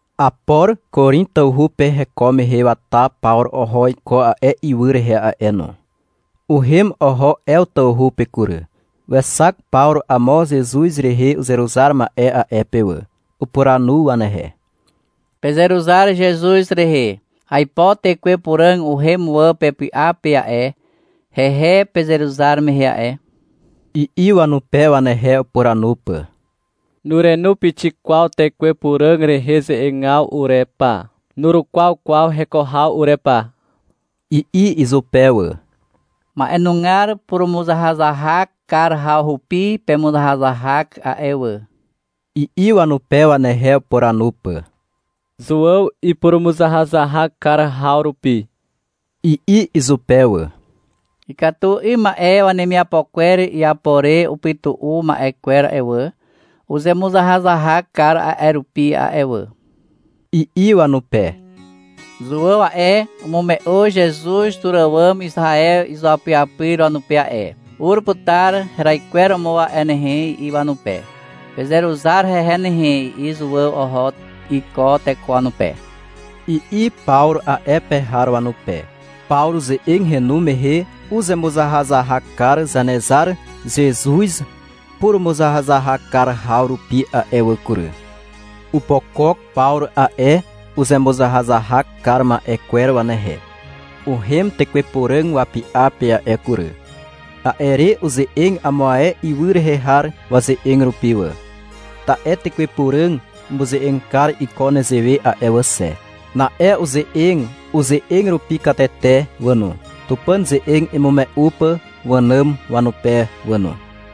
Apor Korin tawhu pe heko mehe wata Pawru oho iko a'e ywy rehe a'e no. Uhem oho Ew tawhu pe kury. Wexak Pawru amo Zezuz rehe uzeruzar ma'e a'e pe wà. Upuranu wanehe. — Pezeruzar Zezuz rehe. Aipo Tekwe Puràg uhem wà pepy'a pe a'e, hehe pezeruzar mehe a'e, i'i wanupe, wanehe upuranu pà. — Nurenu pixik kwaw Tekwe Puràg rehe ze'egaw ure pa, nurukwaw kwaw heko haw ure pa, i'i izupe wà. — Ma'enugar purumuzahazahak kar haw rupi pemuzahazahak a'e wà, i'i wanupe, wanehe upuranu pà. — Zuàw ipurumuzahazahak kar haw rupi, i'i izupe wà. — Ikatu 'ym ma'e wemiapo kwer iapo re upytu'u ma'e kwer a'e wà, uzemuzahazahak kar a'e rupi a'e wà, i'i wanupe. — Zuàw a'e, umume'u Zezuz tur àwàm Izaew izuapyapyr wanupe a'e. — Ur putar heraikweromo a'e nehe, i'i wanupe. — Pezeruzar hehe nehe, i'i Zuàw oho iko teko wanupe, i'i Pawru a'e pe har wanupe. Pawru ze'eg henu mehe uzemuzahazahak kar Zanezar Zezuz purumuzahazahak kar haw rupi a'e wà kury. Opokok Pawru a'e uzemuzahazahak kar ma'e kwer wanehe. Uhem Tekwe Puràg wapy'a pe a'e kury. A'e re uze'eg amo ae ywy rehe har waze'eg rupi wà, ta'e Tekwe Puràg umuze'eg kar iko nezewe a'e wà xe. Na'e uze'eg uze'eg rupi katete wà no, Tupàn ze'eg imume'u pà wànàm wanupe wà no.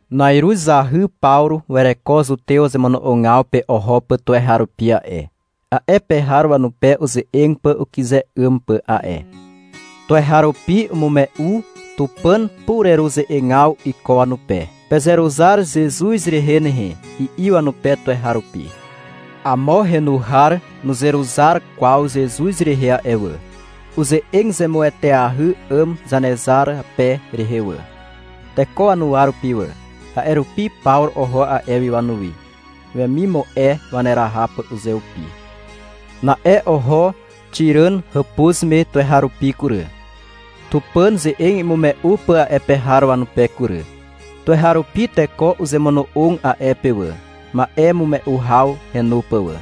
Na'iruz zahy Pawru wereko zutew wazemono'ogaw pe oho pà tuweharupi a'e, a'e pe har wanupe uze'eg pà ukyze 'ym pà a'e. Tuweharupi umume'u Tupàn pureruze'egaw iko wanupe. — Pezeruzar Zezuz rehe nehe, i'i wanupe tuweharupi. Amo henu har nuzeruzar kwaw Zezuz rehe a'e wà. Uze'eg zemueteahy 'àm Zanezar rape rehe wà, teko wanuwa rupi wà. A'e rupi Pawru oho a'e wi wanuwi, wemimu'e waneraha pà uzeupi. Na'e oho Xiràn hàpuz me tuweharupi kury, Tupàn ze'eg imume'u pà a'e pe har wanupe kury. Tuweharupi teko uzemono'og a'e pe wà, ma'emume'u haw henu pà wà.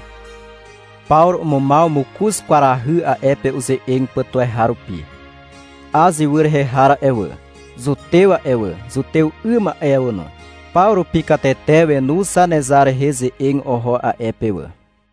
Pawru umumaw mokoz kwarahy a'e pe uze'eg pà tuweharupi. Az ywy rehe har a'e wà, zutew a'e wà, zutew 'ym a'e wà no, paw rupi katete wenu Zanezar rehe ze'eg oho a'e pe wà.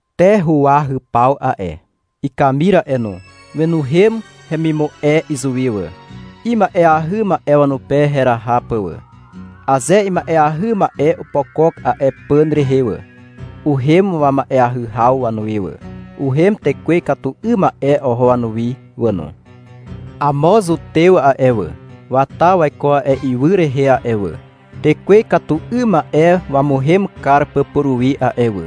Te huwahypaw a'e, ikamir a'e no, wenuhem hemimu'e izuwi wà, ima'eahy ma'e wanupe heraha pà wà. (Aze ima'eahy ma'e opokok a'e pàn rehe wà, uhem wama'eahy haw wanuwi wà. Uhem tekwe ikatu 'ym ma'e oho wanuwi wà no.) Amo zutew a'e wà, wata waiko a'e ywy rehe a'e wà, tekwe ikatu 'ym ma'e wamuhem kar pà puruwi a'e wà.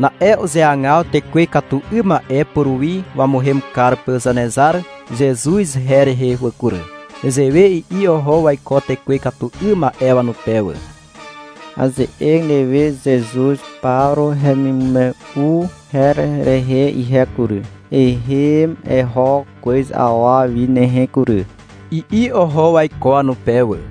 Na'e uzeagaw tekwe ikatu 'ym ma'e puruwi wamuhem kar pà Zanezar Zezuz her rehe wà kury. Nezewe i'i oho waiko tekwe ikatu 'ym ma'e wanupe wà. — Aze'eg newe Zezuz Pawru hemimume'u her rehe ihe kury, ehem eho kwez awa wi nehe kury, i'i oho waiko wanupe wà.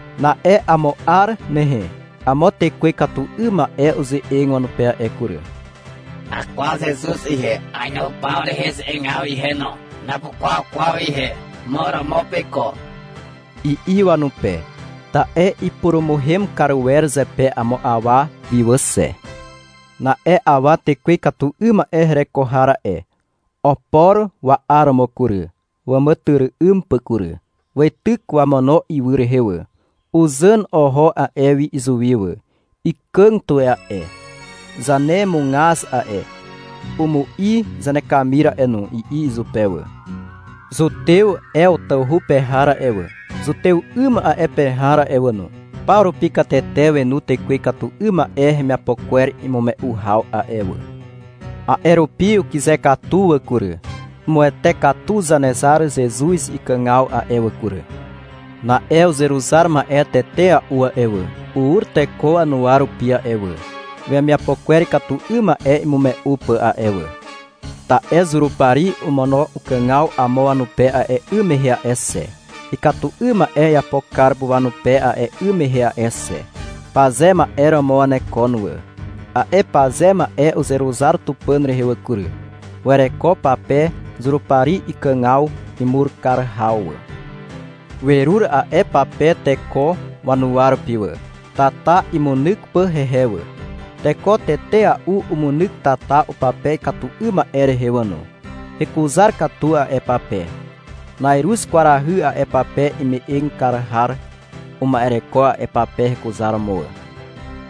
Na'e amo 'ar nehe amo tekwe ikatu 'ym ma'e uze'eg wanupe a'e kury. — Akwaw Zezuz ihe, ainu Pawru rehe ze'egaw ihe no. Napukwaw kwaw ihe, mo romo peiko, i'i wanupe. Ta'e ipurumuhem kar wer zepe amo awa wi wà xe. Na'e awa tekwe ikatu 'ym ma'e hereko har a'e, opor wa'aromo kury, wàmàtyry'ym pà kury. Weityk wamono ywy rehe wà. Uzàn oho a'e wi izuwi wà. — Ikàg tuwe a'e, zanemugaz a'e, umu'i zanekamir a'e no, i'i izupe wà. Zutew Ew tawhu pe har a'e wà, zutew 'ym a'e pe har a'e wà no, paw rupi katete wenu tekwe ikatu 'ym ma'e hemiapo kwer imume'u haw a'e wà. A'e rupi ukyze katu wà kury. Umuwete katu Zanezar Zezuz ikàgaw a'e wà kury. Na'e uzeruzar ma'e tetea'u a'e wà, ur teko wanuwa rupi a'e wà, wemiapo kwer ikatu 'ym ma'e imume'u pà a'e wà. Ta'e Zurupari omono ukàgaw amo wanupe a'e 'ym mehe a'e xe, ikatu 'ym ma'e iapo kar pà wanupe a'e 'ym mehe a'e xe. Paze ma'e romo wanekon wà. A'e paze ma'e uzeruzar Tupàn rehe wà kury. Wereko pape Zurupari ikàgaw imur kar haw wà. Werur a'e pape teko wanuwa rupi wà, tata imunyk pà hehe wà. Teko tetea'u umunyk tata upape ikatu 'ym ma'e rehe wà no. Hekuzar katu a'e pape. (Na'iruz kwarahy a'e pape ime'eg kar har uma'ereko a'e pape hekuzaromo wà.)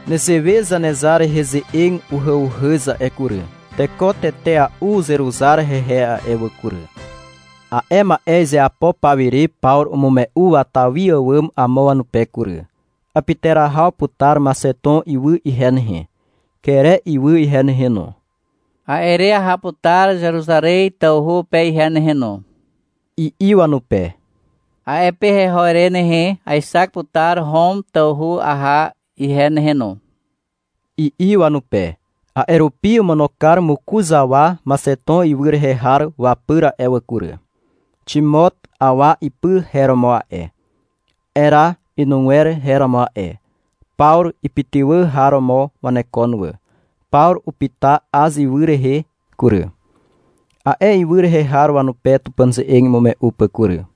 Nezewe Zanezar rehe ze'eg uhàuhàz a'e kury. Teko tetea'u uzeruzar hehe a'e wà kury. A'e ma'e izeapo pawire Pawru umume'u wata wi àwàm amo wanupe kury. — Apyterahaw putar Maxeton ywy ihe nehe, Kere ywy ihe nehe no. A'e re aha putar Zeruzarez tawhu pe ihe nehe no, i'i wanupe. — A'e pe heho re nehe, aexak putar Hom tawhu aha ihe nehe no, i'i wanupe. A'e rupi omono kar mokoz awa Maxeton ywy rehe har wapyr a'e wà kury. Ximot awa ipy her romo a'e. Era inugwer her romo a'e. Pawru ipytywà har romo wanekon wà. Pawru upyta Az ywy rehe kury, a'e ywy rehe har wanupe Tupàn ze'eg imume'u pà kury.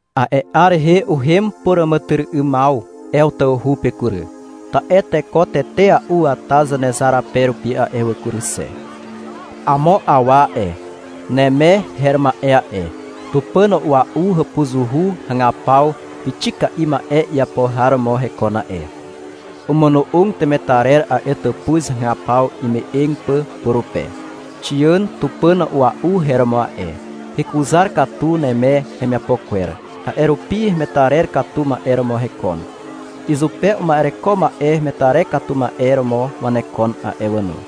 A'e 'ar rehe uhem puràmàtyry'ymaw Ew tawhu pe kury, ta'e teko tetea'u wata Zanezar rape rupi a'e wà kury xe. Amo awa a'e, Neme her ma'e a'e, tupàn a'ua'u hàpuzuhu hagapaw pixika'i ma'e iapo har romo hekon a'e. Omono'og temetarer a'e tàpuz hagapaw ime'eg pà purupe. Xiàn tupàn a'ua'u her romo a'e. Hekuzar katu Neme hemiapo kwer, a'e rupi hemetarer katu ma'e romo hekon. Izupe uma'ereko ma'e hemetarer katu ma'e romo wanekon a'e wà no.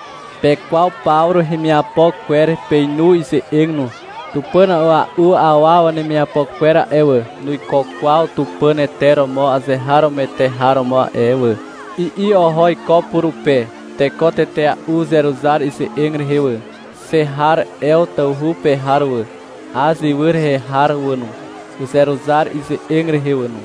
— Pekwaw Pawru hemiapo kwer. Peinu ize'eg no. — Tupàn a'ua'u awa wanemiapo kwer a'e wà, nuiko kwaw tupàn ete romo azeharomoete har romo a'e wà, i'i oho iko purupe. Teko tetea'u uzeruzar ize'eg rehe wà. Xe har Ew tawhu pe har wà, Az ywy rehe har wà no, uzeruzar ize'eg rehe wà no.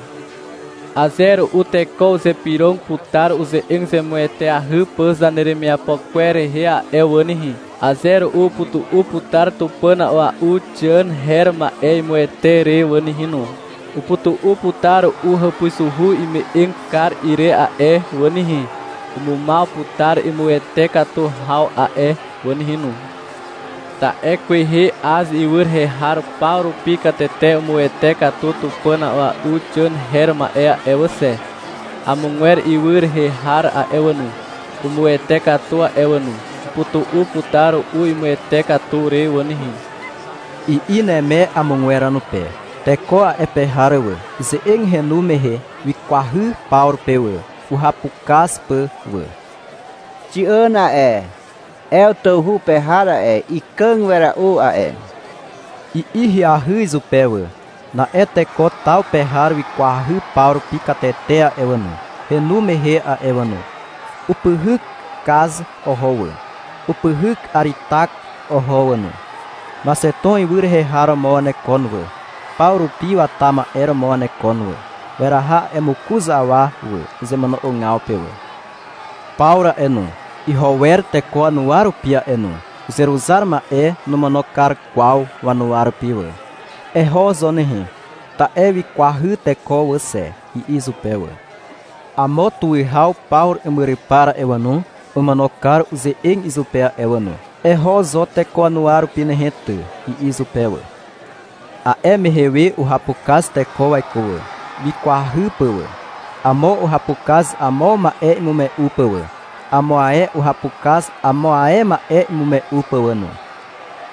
Aze ru'u teko uzypyrog putar uze'eg zemueteahy pà zaneremiapo kwer rehe a'e wà nehe. Aze ru'u upytu'u putar tupàn a'ua'u Xiàn her ma'e imuwete re wà nehe no. Upytu'u putar ru'u hàpuzuhu ime'eg kar ire a'e wà nehe. Umumaw putar imuwete katu haw a'e wà nehe no. Ta'e kwehe Az ywy rehe har paw rupi katete umuwete katu tupàn a'ua'u Xiàn her ma'e a'e wà xe. Amogwer ywy rehe har a'e wà no, umuwete katu a'e wà no. Upytu'u putar ru'u imuwete katu re wà nehe, i'i Neme amogwer wanupe. Teko a'e pe har wà, ize'eg henu mehe wikwahy Pawru pe wà, uhapukaz pà wà. — Xiàn a'e, Ew tawhu pe har a'e, ikàg wera'u a'e, i'i ahyahy izupe wà. Na'e teko taw pe har wikwahy paw rupi katete a'e wà no, henu mehe a'e wà no. Upyhyk Kaz oho wà, upyhyk Aritak oho wà no. Maxeton ywy rehe har romo wanekon wà, Pawru rupi wata ma'e romo wanekon wà. Weraha a'e mokoz awa wà, uzemono'ogaw pe wà. Pawru a'e no, iho wer teko wanuwa rupi a'e no. Uzeruzar ma'e nomono kar kwaw wanuwa rupi wà. — Eho zo nehe, ta'e wikwahy teko wà xe, i'i izupe wà. Amo tuwihaw Pawru imyrypar a'e wà no, omono kar uze'eg izupe a'e wà no. — Eho zo teko wanuwa rupi nehe ty, i'i izupe wà. A'e mehe we uhapukaz teko waiko wà, wikwahy pà wà. Amo uhapukaz amo ma'e imume'u pà wà. Amo ae uhapukaz amo ae ma'e imume'u pà wà no.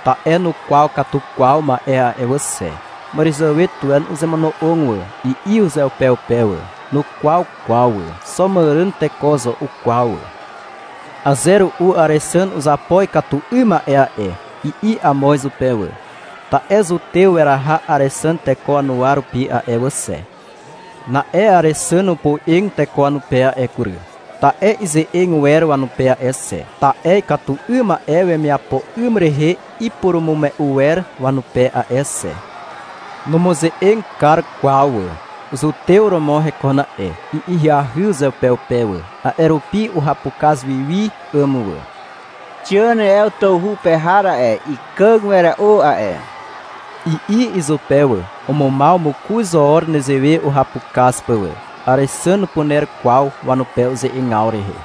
Ta'e nukwaw katu kwaw ma'e a'e wà xe. — Màràzàwe tuwe uzemono'og wà, i'i uzeupeupe wà. Nukwaw kwaw wà. Xo màràn teko zo ukwaw wà. — Aze ru'u Àrexàn uzapo ikatu 'ym ma'e a'e, i'i amo izupe wà. Ta'e zutew weraha Àrexàn teko wanuwa rupi a'e wà xe. Na'e Àrexàn opoe'eg teko wanupe a'e kury, ta'e ize'eg wer wanupe a'e xe, ta'e ikatu 'ym ma'e wemiapo 'ym rehe ipurumume'u wer wanupe a'e xe. (Numuze'eg kar kwaw wà.) — Zutew romo hekon a'e, i'i ahyahy uzeupeupe wà. A'e rupi uhapukaz wi wi 'àm wà. — Xiàn Ew tawhu pe har a'e, ikàg wera'u a'e, i'i izupe wà. Umumaw mokoz 'or nezewe uhapukaz pà wà. Àrexàn nupuner kwaw wanupe uze'egaw rehe.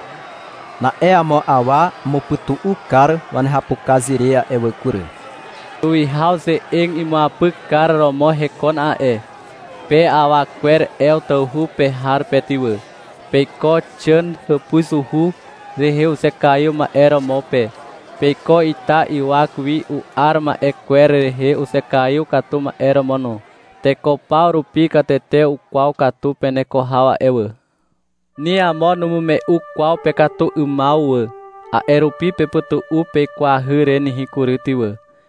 Na'e amo awa umupytu'u kar wanehapukaz re a'e wà kury. Tuwihaw ze'eg imuapykar romo hekon a'e. — Pe awa kwer Ew tawhu pe har pe ty wà. Peiko Xiàn hàpuzuhu rehe uzekaiw ma'e romo pe. Peiko ita ywak wi u'ar ma'e kwer rehe uzekaiw katu ma'e romo no. Teko paw rupi katete ukwaw katu peneko haw a'e wà. Ni amo numume'u kwaw pekatu 'ymaw wà. A'e rupi pepytu'u peikwahy re nehe kury ty wà.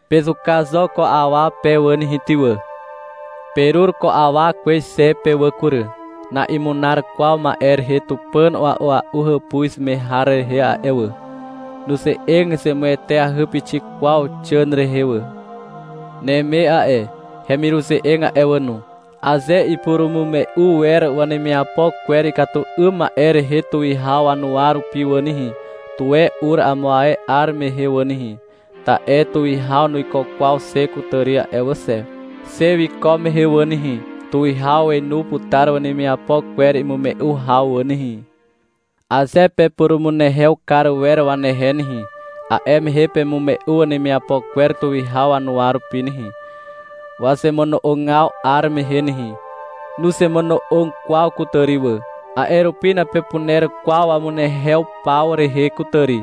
Pezuka zo ko awa pe wà nehe ty wà. Perur ko awa kwez xe pe wà kury. Na'imunar kwaw ma'e rehe tupàn a'ua'u hàpuz me har rehe a'e wà. Nuze'eg zemueteahy pixik kwaw Xiàn rehe wà. Neme a'e, hemiruze'eg a'e wà no, aze ipurumume'u wer wanemiapo kwer ikatu 'ym ma'e rehe tuwihaw wanuwa rupi wà nehe, tuwe ur amo ae 'ar mehe wà nehe, ta'e tuwihaw nuiko kwaw xe kutàri a'e wà xe. Xe wiko mehe wà nehe, tuwihaw wenu putar wanemiapo kwer imume'u haw wà nehe. Aze pepurumunehew kar wer wanehe nehe, a'e mehe pemume'u wanemiapo kwer tuwihaw wanuwa rupi nehe, wazemono'ogaw 'ar mehe nehe. Nuzemono'og kwaw kutàri wà. A'e rupi napepuner kwaw wamunehew paw rehe kutàri.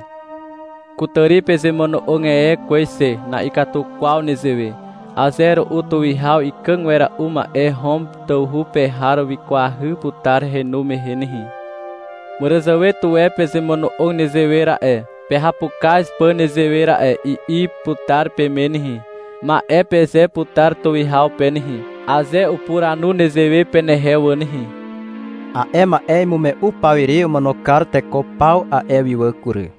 Kutàri pezemono'og e kwez xe. Na'ikatu kwaw nezewe. Aze ru'u tuwihaw ikàg wera'u ma'e Hom tawhu pe har wikwahy putar henu mehe nehe. — Màràzàwe tuwe pezemono'og nezewe ra'e, pehapukaz pà nezewe ra'e, i'i putar peme nehe. Ma'e peze putar tuwihaw pe nehe, aze upuranu nezewe penehe wà nehe. A'e ma'e imume'u pawire omono kar teko paw a'e wi wà kury.